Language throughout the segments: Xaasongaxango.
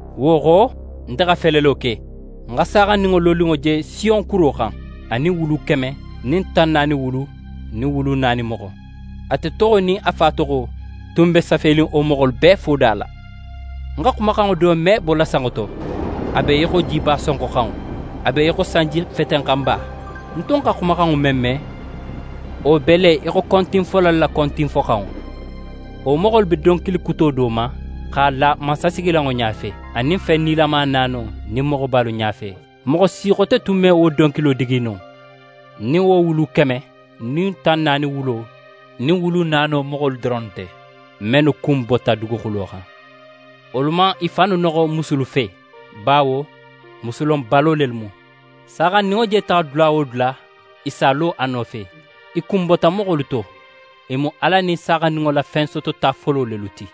Wo xo, nte xa felelo ke: Ń xa Saaxandinŋo loninŋo je Siyon kuro xan, a nin wulu keme nin tan naani wulu nin wulu naani moxo. Ate toxo nin a Fa toxo tun be safenin wo moxolu bee foda la. Ń xa xumaxanŋo do me bola sanŋo to. A be í xo jiba sonxoxanŋo, a be í xo sanjifetenxanba. Ń tun xa xumaxanŋo men me, wo be le í xo kontinfolalu la kontinfoxanŋo. Wo moxolu be donkili kuto do ma x'a la mansasigilanŋo ɲafe, anin fen nilama naano nin moxobalu ɲafe. Moxo si xote tun me wo donkilo digi no, nin wo wulu keme nin tan naani wulo nin wulu naano moxolu doronnu nte, mennu kunbota duguxulo xan. Wolu man i fannu noxo musulu fe, bawo musulonbalo lelu mu. Saaxandinŋo je taxa dula wo dula, i si a lo a nofe. I kunbota moxolu to. I mu Ala nin Saaxandinŋo la fensotota folo lelu ti.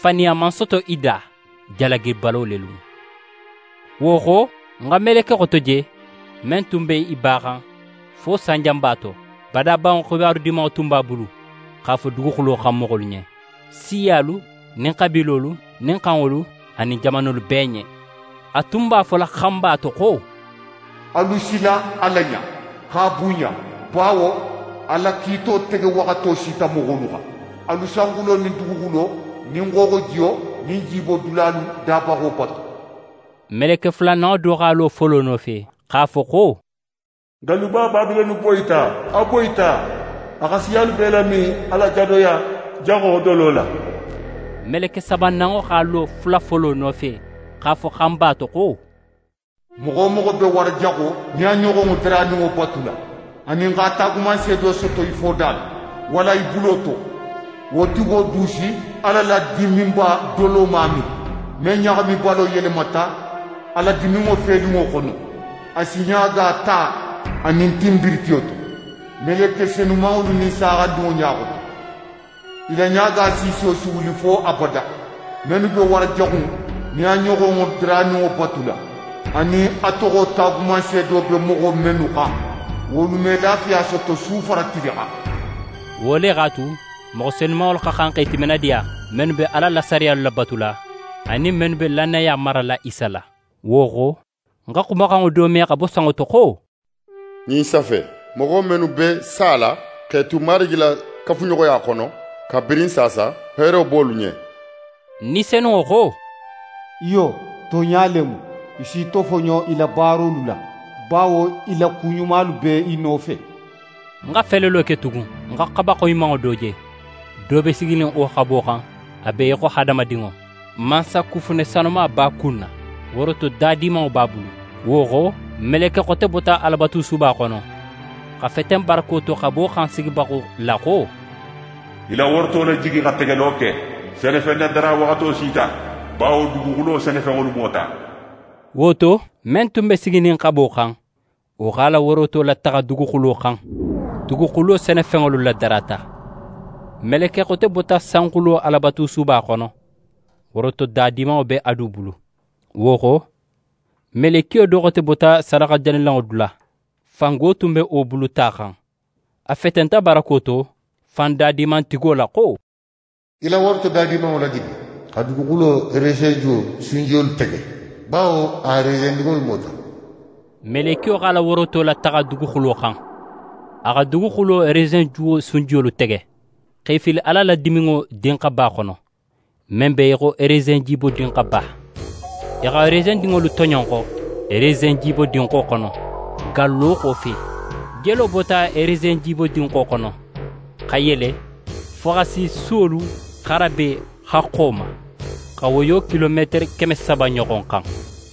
Faniya man soto i da. Jalagibalo lelu mu. Wo xo, ń xa meleke xote je men tun be í baxan fo sanjanba to. Badabanŋo xibaru Dimanŋo tun b'a bulu x'a fo duguxulo xan moxolu ɲen, siyalu nin xabiilolu nin xanŋolu, anin jamanolu bee ɲen. A tun b'a fola xanba to xo: «Alu sila Ala ɲa, x'a bunɲa, bawo a la kiito tege waxato sita moxolu xan. Alu sanxulo nin duguxulo nin xooxojiyo nin jibodulalu dabaxo batu.» Meleke fulananŋo do x'a lo folo nofe, x'a fo xo: «Galluba Babilone boyita, a boyita! A xa siyalu bee lamin a la jadoya jaxo dolo la.» Meleke sabananŋo x'a lo fula folo nofe, x'a fo xanba to xo: «Moxo wo moxo be wara jaxo nin a ɲoxonŋo daraninŋo batula, anin x'a taagumanseedo soto í foda la, walla í bulo to, wo tigo du si Ala la diminba doloma min, men ɲaxamibalo yelemata a la diminŋo felinŋo xono. A si ɲaaga ta anin tinbiritiyo to, meleke senumanŋolu nin Saaxandinŋo ɲa xoto. I la ɲaaga siisiyo si wuli fo abada. Mennu be wara jaxu in nin a ɲoxonŋo daraninŋo batula, anin a toxo taagumanseedo be moxo mennu xan, wolu me lafiya soto su fara tili xan.» Wo le x'a tu, moxo senumanŋolu xa xan x'e timinadiya, mennu be Ala la sariyalu labatula anin mennu be lannaya marala Isa la. Wo xo, ń xa xumaxanŋo do me xa bo sanŋo to xo: «Ɲin safe: “Moxo mennu be sala x'e tu Marigi la kafuɲoxoya xono kabirin saasa, heero be wolu ɲen!” Ni Senunŋo xo: “Iyo, tonɲa le mu, i s'i tofoɲo i la baarolu la bawo i la kuɲumalu be i nofe!”» Ń xa felelo ke tugun, ń xa xaba xoyimanŋo do je, do be siginin wo xabo xan a be í xo hadamadinŋo. Mansakufune sanuma b'a kunna, woroto da dimanŋo b'a bulu. Wo xo, meleke xote bota Alabatusuba xono, xa feten barako to xabo xan sigibaxo la xo: «Í la woroto lajigi xa tegelo ke. Senefennadara waxato sita, bawo duguxulo senefenŋolu mota!» Wo to, men tun be siginin xabo xan, wo x'a la woroto lataxa duguxulo xan, duguxulo senefenŋolu ladarata. Meleke xote bota sanxulo Alabatusuba xono, woroto da dimanŋo be a du bulu. Wo xo, melekiyo do xote bota sadaxajanilanŋo dula. Fango tun be wo bulu ta xan. A fetenta barako to fan dadimantigo la xo: «Í la woroto da dimanŋo lajigi xa duguxulo resenjuwo sunjiyolu tege, bawo a resendinŋolu mota.» Melekiyo x'a la woroto lataxa duguxulo xan, a xa duguxulo resenjuwo sunjiyolu tege, x'e fili Ala la diminŋo dinxaba xono, men be í xo resenjibodinxaba. I xa resendinŋolu toɲonxo resenjibodinxo xono, gallo xofe. Jelo bota resenjibodinxo xono xa yele fo xa si suwolu xarabe haxxo ma, xa woyo kilometere keme saba ɲoxon xan.